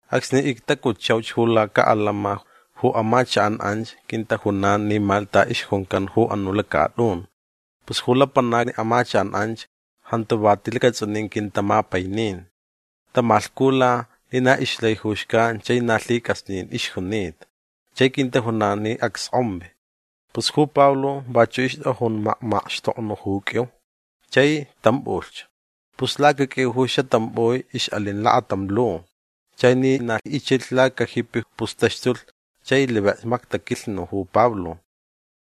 Acsni ictacutchauch ju lacaʼalama ju amachakʼan anch quintajunan ni Malta ixjuncan ju anuʼ lacatʼun. Pus ju lapanacni amachakʼan anch jantu va ti lacatsʼunin quintamapainin. Tamalhcula ni na ixlai ju xcan chai na lhicʼasnin ixjunita. Chai quintajunan ni acskʼonvi. Pus ju Pablo vachuʼ ixtʼajun makmakxtoknuʼ ju qʼuiu. Chai tʼampʼulhch. Pus lacaqʼuiu ju xatʼampʼui ixʼalin lakatam lu. Chai ni na ichilh lacajipi pus taxtulh chai livik mactaquilhnu ju Pablo.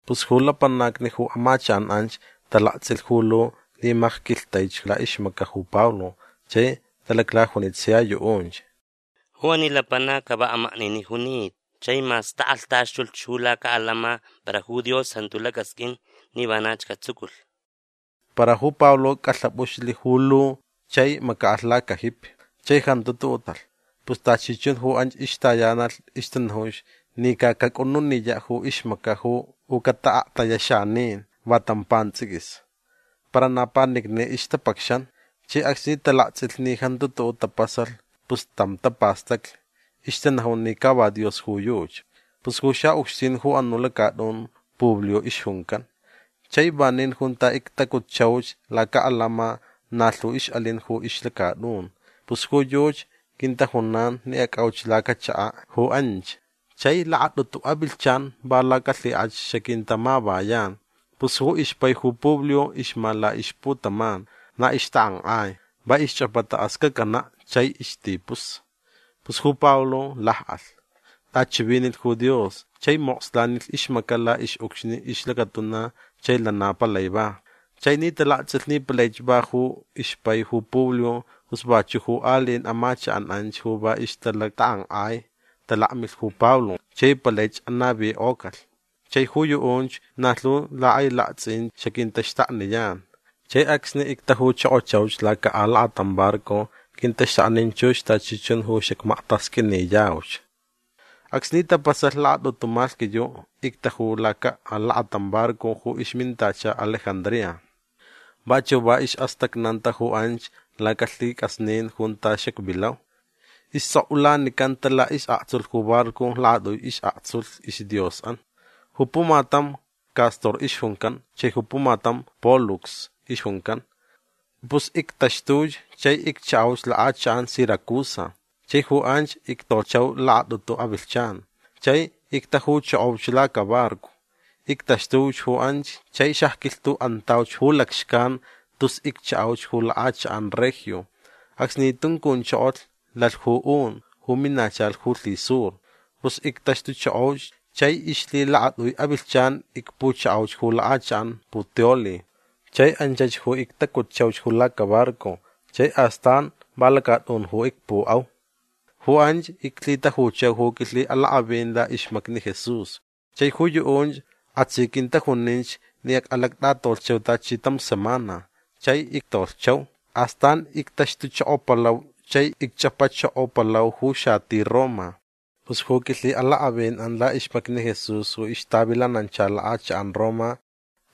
Pus ju lapanacni ju amachakʼan anch talaktsʼilh ju lu ni macquilhtaich laʼixmacaʼ ju Pablo chai talaclajunich sia yuʼunch: ―Ju ani lapanac ca va amakniniʼ junita. Chai mas takʼalhtaxtulh ju lacaʼalama para ju Dios jantu lacasqʼuin ni vanach catsuculh. Para ju Pablo cʼalhapʼuxlh ju lu chai macaʼalh lacajipi. Chai jantu tuʼuʼ tapasalh. Pus tachi chun ju anch ixtayanalh ixtanajunch ni ca cacʼununiyaʼ ju ixmacaʼ u cataʼaktayaʼ xanin va tam pantsʼiquis. Para na panicni ixtapacxan. Chai acsni talaktsʼilh ni jantu tuʼuʼ tapasalh pus tam tapastaclh. Ixtanajun ni ca va dios ju yuchi. Pus ju xaʼucxtin ju anuʼ lacatʼun Publio ixjuncan. Chai vanin junta ictacutchauch lacaʼalama na lhu ixʼalin ju ixlacatʼun. Pus ju yuchi quintajunan ni acʼauch lacachakaʼ ju anch. Chai lakatʼutu avilhchan va lacalhikʼach xaquintamavayan. Pus ju ixpai ju Publio ixma laʼixputaman. Na ixtakʼankʼai. Va ixchʼapata ascacanaʼ chai istipus. Pus ju Pablo lakʼalh. Tʼachivinilh ju Dios chai mokslanilh ixmacaʼ laʼixʼucxni ixlacatuna chai lana palai va. Chai ni talaktsʼilh ni palaich va ju ixpai ju Publio pus vachuʼ ju aliʼin amachakʼan anch ju va ixtalactakʼankʼai talakmilh ju Pablo chai palaich anavikʼocalh. Chai ju yuʼunch na lhu lhakʼailaktsʼin xaquintaxtakniyan. Chai acsni ictajuchokochauch laca alakatam barco quintaxtaknin chux tachi chun ju xacmaktasqʼuiniyauch. Acsni tapasalh lakatʼutu malhquiyuʼ ictaju laca alakatam barco ju ixmintacha Alejandría. Vachuʼ va isʼastacnanta ju anch lacalhicʼasnin junta xacvilau. Istsʼokʼulanicanta laʼisʼaktsulh ju barco lakatʼui isʼaktsulh isdiosʼan. Ju pumatam Cástor ixjuncan chai ju pumatam Pólux ixjuncan. Pus ictaxtuch chai icchaʼauch lakʼachakʼan Siracusa. Chai ju anch ictolhchau lakatʼutu avilhchan. Chai ictajuchokoch lacabarco. Ictaxtuch ju anch chai xacquilhtuʼantauch ju lacxcan tus icchaʼauch ju lakʼachakʼan Regio. Acsni tuncunchokolh lalh ju un ju minachalh ju lhisur. Pus ictaxtuchokoch chai ixlhilakatʼui avilhchan icpuchaʼauch ju lakʼachakʼan Puteoli. Chai anchach ju ictacutchauch ju lacabarco chai astan va lacatʼun ju icpuʼau. Ju anch iclhitajuchau ju quilhiʼalakʼavin laʼixmacni Jesús. Chai ju yuʼunch kʼasi quintajuninch ni acʼalactʼatolhchau tachi tam semana. Chai ictolhchau. Astan ictaxtuchokopalau chai icchʼapachokopalau ju xati Roma. Pus ju quilhiʼalakʼavinʼan laʼixmacni Jesús ju ixtavilanancha lakʼachakʼan Roma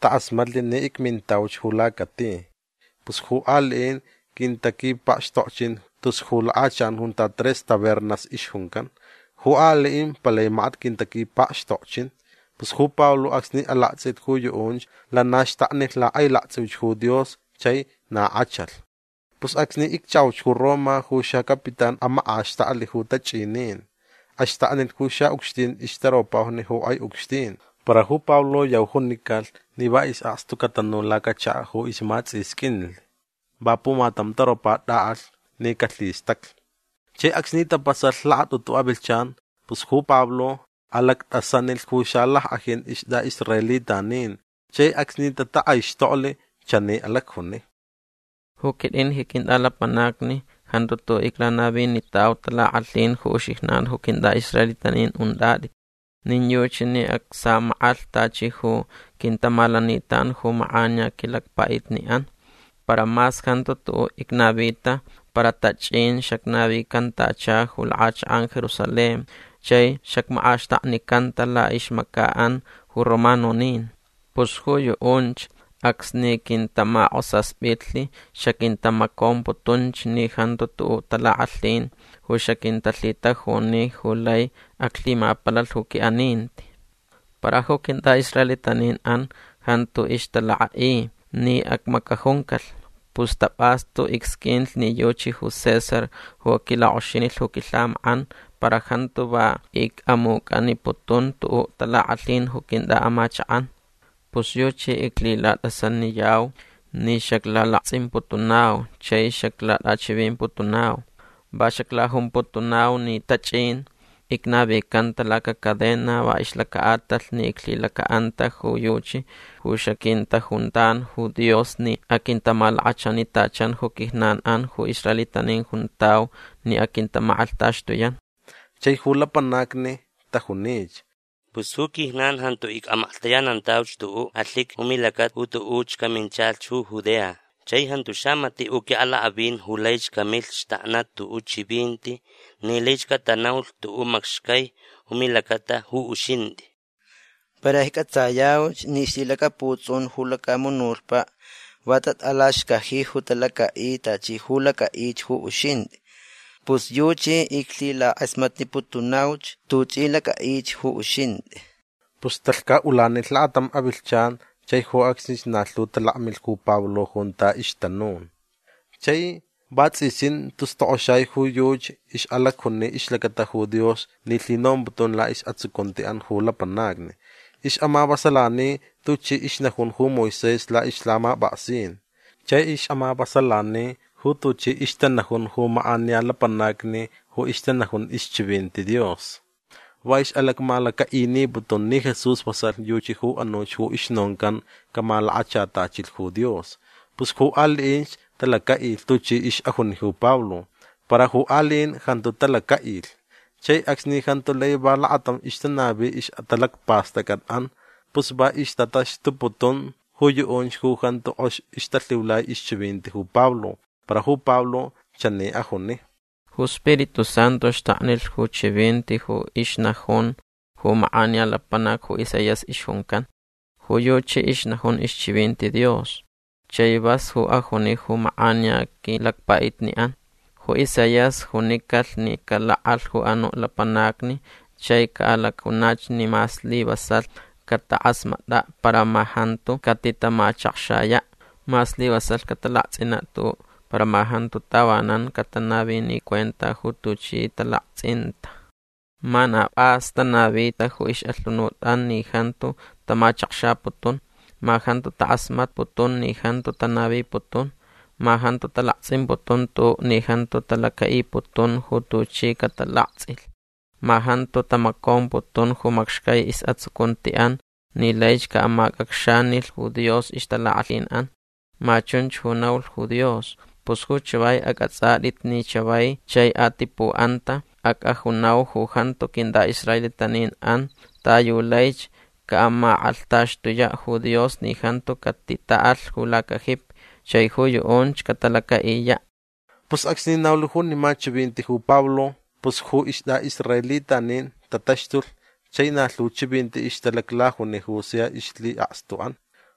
takʼasmatlh ni icmintauch ju lacati. Pus ju aliʼin quintaquipakxtokchin tus ju lakʼachakʼan junta Tres Tabernas ixjuncan. Ju aliʼin palai makat quintaquipakxtokchin. Pus ju Pablo acsni alaktsʼilh ju yuʼunch lana xtaknilh lakʼailaktsʼiuch ju Dios chai na kʼachalh. Pus acsni icchaʼauch ju Roma ju xacapitán amakʼaxtaklh ju tachʼinin. Axtaknilh ju xaʼucxtin ixtaropajni ju kʼai ucxtin. Para ju Pablo yau junicalh ni va isʼakstu catanu lacachakaʼ ju ismatsʼisqʼuinlh. Va pumatam taropa tʼaʼalh ni calhistaclh. Chai acsni tapasalh lakatʼutu avilhchan pus ju Pablo alactʼasanilh ju xalackʼajin istʼaʼisraelitanin. Chai acsni tatakʼaixtoklh chani alacjuni: ―Ju quitʼin ji quintʼalapanacni jantu tuʼuʼ iclanavinitau talakʼalhin ju uxijnan ju quintʼaʼisraelitanin untʼatʼit. Nin yuchi ni acsamakʼalh tachi ju quintamalanitan ju makʼaniya quilacpaʼitniʼan. Para mas jantu tuʼuʼ icnavita para tachʼin xacnavicantacha ju lakʼachakʼan Jerusalén chai xacmakʼaxtaknicanta laʼixmacaʼan ju romanonin. Pus ju yuʼunch acsni quintamakʼosaspitlh xaquintamacomputunch ni jantu tuʼuʼ talakʼalhin ju xaquintalhitajuni ju lai aclhimapalalh ju quiʼaninti. Para ju quintʼaʼisraelitaninʼan jantu ixtalakʼaʼi ni acmacajuncalh. Pus tapʼastu icsqʼuinlh ni yuchi ju César ju aquilakʼoxinilh ju quilhamakʼan para jantu va icʼamucʼaniputun tuʼuʼ talakʼalhin ju quintʼaʼamachakʼan. Pus yuchi iclhilatʼasaniyau ni xaclalaktsʼimputunau chai xaclatʼachivimputunau. Va xaclajumputunau ni tachʼin icnavicanta lacacadena va ixlacaʼatalh ni iclhilacaʼanta ju yuchi ju xaquintajuntan ju Dios ni aquintamalakachanitachan ju quijnanʼan ju israelitanin juntau ni aquintamakʼalhtaxtuyan. Chai ju lapanacni tajunich: ―Pus ju quijnan jantu icʼamaklhtayanantauch tuʼuʼ alhiqui ju milacata ju tuʼuch caminchalh ju Judea. Chai jantu xamatiʼ ju quiʼalakʼavin ju laich camilh xtaknaʼ tuʼuʼ chivinti ni lai catanaulh tuʼuʼ macxcai ju milacata ju uxintʼi. Para iccʼatsayauch ni ixlhilacaputsʼun ju lacamunutpaʼ va tatʼalaxcaji ju talacaʼi tachi ju lacʼaʼich ju uxintʼi. Pus yuchi iclhilakʼasmatniputunauch tuchʼi lacʼaʼich ju uxintʼi. Pus talhcaʼulanilh lakatam avilhchan chai ju acsnich na lhu talakmilh ju Pablo junta ixtanun. Chai vatsʼisin tus tokʼoxai ju yuchi ixʼalacjuni ixlacata ju Dios ni lhinomputun laʼisʼatsucuntiʼan ju lapanacni. Ixʼamavasalani tuchi ixnajun ju Moisés laʼixlhamapʼaksin. Chai ixʼamavasalani ju tuchi ixtanajun ju makʼaniya lapanacni ju ixtanajun ixchivinti Dios. Va ixʼalacmalacaʼiniputun ni Jesús vasalh yuchi ju anuch ju ixnoncan camalakachatachilh ju Dios. Pus ju aliʼinch talacaʼilh tuchi ixʼajuni ju Pablo. Para ju aliʼin jantu talacaʼilh. Chai acsni jantu lai va lakatam ixtanavi ixʼatalacpastʼacʼatʼan pus va ixtataxtuputun ju yuʼunch ju jantu kʼox ixtalhiulai ixchivinti ju Pablo. Para ju Pablo chani ajuni: ―Ju Spiritu Santu xtaknilh ju chivinti ju ixnajun ju makʼaniya lapanac ju Isaías ixjuncan. Ju yuchi ixnajun ixchivinti Dios. Chai vas ju ajuni ju makʼaniya quilacpaʼitniʼan. Ju Isaías junicalh ni calakʼalh ju anuʼ lapanacni chai caʼalacjunach ni ma slivasalh catakʼasmatʼaʼ para ma jantu catitamachakxayaʼ. Ma slivasalh catalaktsʼinaʼ tuʼuʼ para ma jantu tavanan catanavini cuenta ju tuchi talaktsʼinta. Ma na pʼas tanavita ju ixʼalhunutʼan ni jantu tamachakxaputun. Ma jantu takʼasmatputun ni jantu tanaviputun. Ma jantu talaktsʼimputun tuʼuʼ ni jantu talacaʼiputun ju tuchi catalaktsʼilh. Ma jantu tamacomputun ju macxcai isʼatsucuntiʼan ni laich caʼamacʼacxanilh ju Dios ixtalakʼalhinʼan. Ma chunch ju naulh ju Dios. Pus ju chavai acʼatsʼatʼit ni chavai chai atipuʼanta acʼajunau ju jantu quintʼaʼisraelitaninʼan ta yu laich caʼamakʼalhtaxtuyaʼ ju Dios ni jantu catitaʼalh ju lacajipi. Chai ju yuʼunch catalacaʼiyaʼ. Pus acsni naulh junima chivinti ju Pablo pus ju istʼaʼisraelitanin tataxtulh chai na lhu chivinti ixtalaclajuni ju sia ixlhiʼakstuʼan.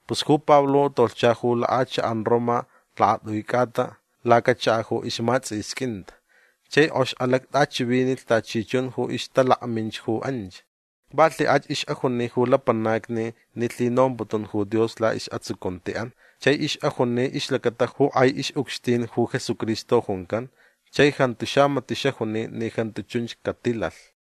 Pus ju Pablo tolhcha ju lakʼachakʼan Roma lakatʼui cʼata lacachakaʼ ju ismatsʼisquinta. Chai kʼox alactʼachivinilh tachi chun ju ixtalakminch ju anch. Va lhikʼach ixʼajuni ju lapanacni ni lhinomputun ju Dios laʼisʼatsucuntiʼan. Chai ixʼajuni ixlacata ju kʼai ixʼucxtin ju Jesucristo juncan. Chai jantu xamatiʼ xajuni ni jantu chunch catilalh.